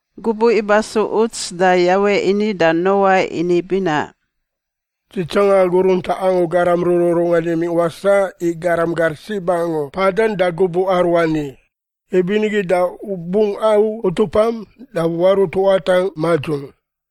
Gubuꞌ ibasu uts da Yawe ini da Noa ini binaꞌ, “Dzi tsanga agu runtaꞌ angu garam rururungan imingꞌ wasaꞌ i garam gar sib angu mpadan da gubuꞌ aruani. Ibinigi da u bungꞌ au utupam da warut watangꞌ madzung.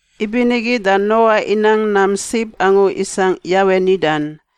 Ibinigi da Noa inang nam sib angu isangꞌ Yawe nidan.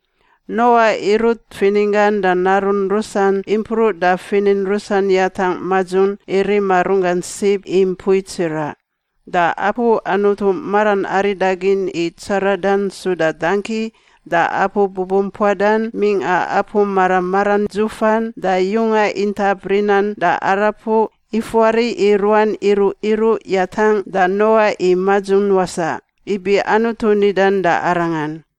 Noa irut fininggan da narun rusan impruꞌ da finin rusan yatangꞌ madzung i rima runggan sib i mpui tsiraꞌ. Da apu Anutu maran aridagin i tsaradan suda dangki da apu bubumpuadan mingꞌa apu mara maran dzufan da yunga intap rinan da arapuꞌ ifuari i ruan iruꞌ iruꞌ yatangꞌ da Noa i madzung wasaꞌ ibi Anutu nidan da arangan.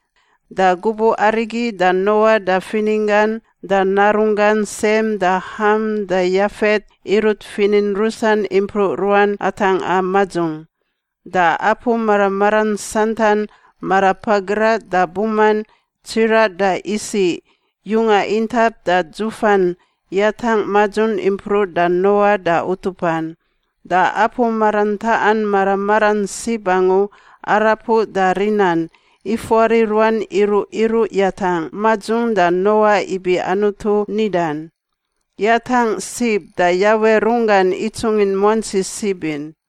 Da gubuꞌ arigi da Noa da fininggan da narunggan Sem da Ham da Yafet irut finin rusan impruꞌ ruan atangꞌa madzung. Da apu mara maran santan— marapagraꞌ da buman, tsiraꞌ da isiꞌ, yunga intap da dzufan— yatangꞌ madzung impruꞌ da Noa da utupan. Da apu marantaꞌan mara maran sib angu, arapuꞌ da rinan, ifuari ruan iruꞌ iruꞌ yatangꞌ madzung da Noa ibi Anutu nidan. Yatangꞌ sib da Yawe runggan itsungin muantsi sib in.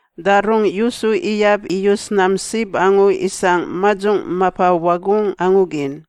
Da rungꞌ yusu iyab iyus nam sib angu isangꞌ madzung mapa wagungꞌ angu gin.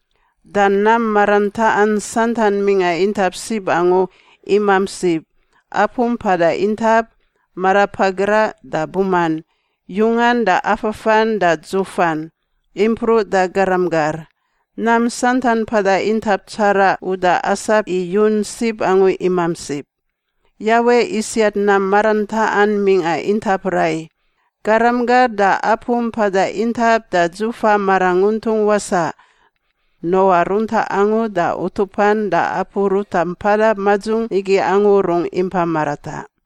Da nam marantaꞌan santan mingꞌa intap sib angu imamp sib— apu mpada intap, marapagraꞌ da buman, yungan da afafan da dzufan, impruꞌ da garam gar. Nam santan mpada intap tsaraꞌ uda asap i yun sib angu imamp sib. Yawe isiat nam marantaꞌan mingꞌa intap rai: garam gar da apu mpada intap da dzufa maranguntung wasaꞌ. Noa runtaꞌ angu da utupan da apu ruta mpada madzung igi angu rungꞌ impa marataꞌ.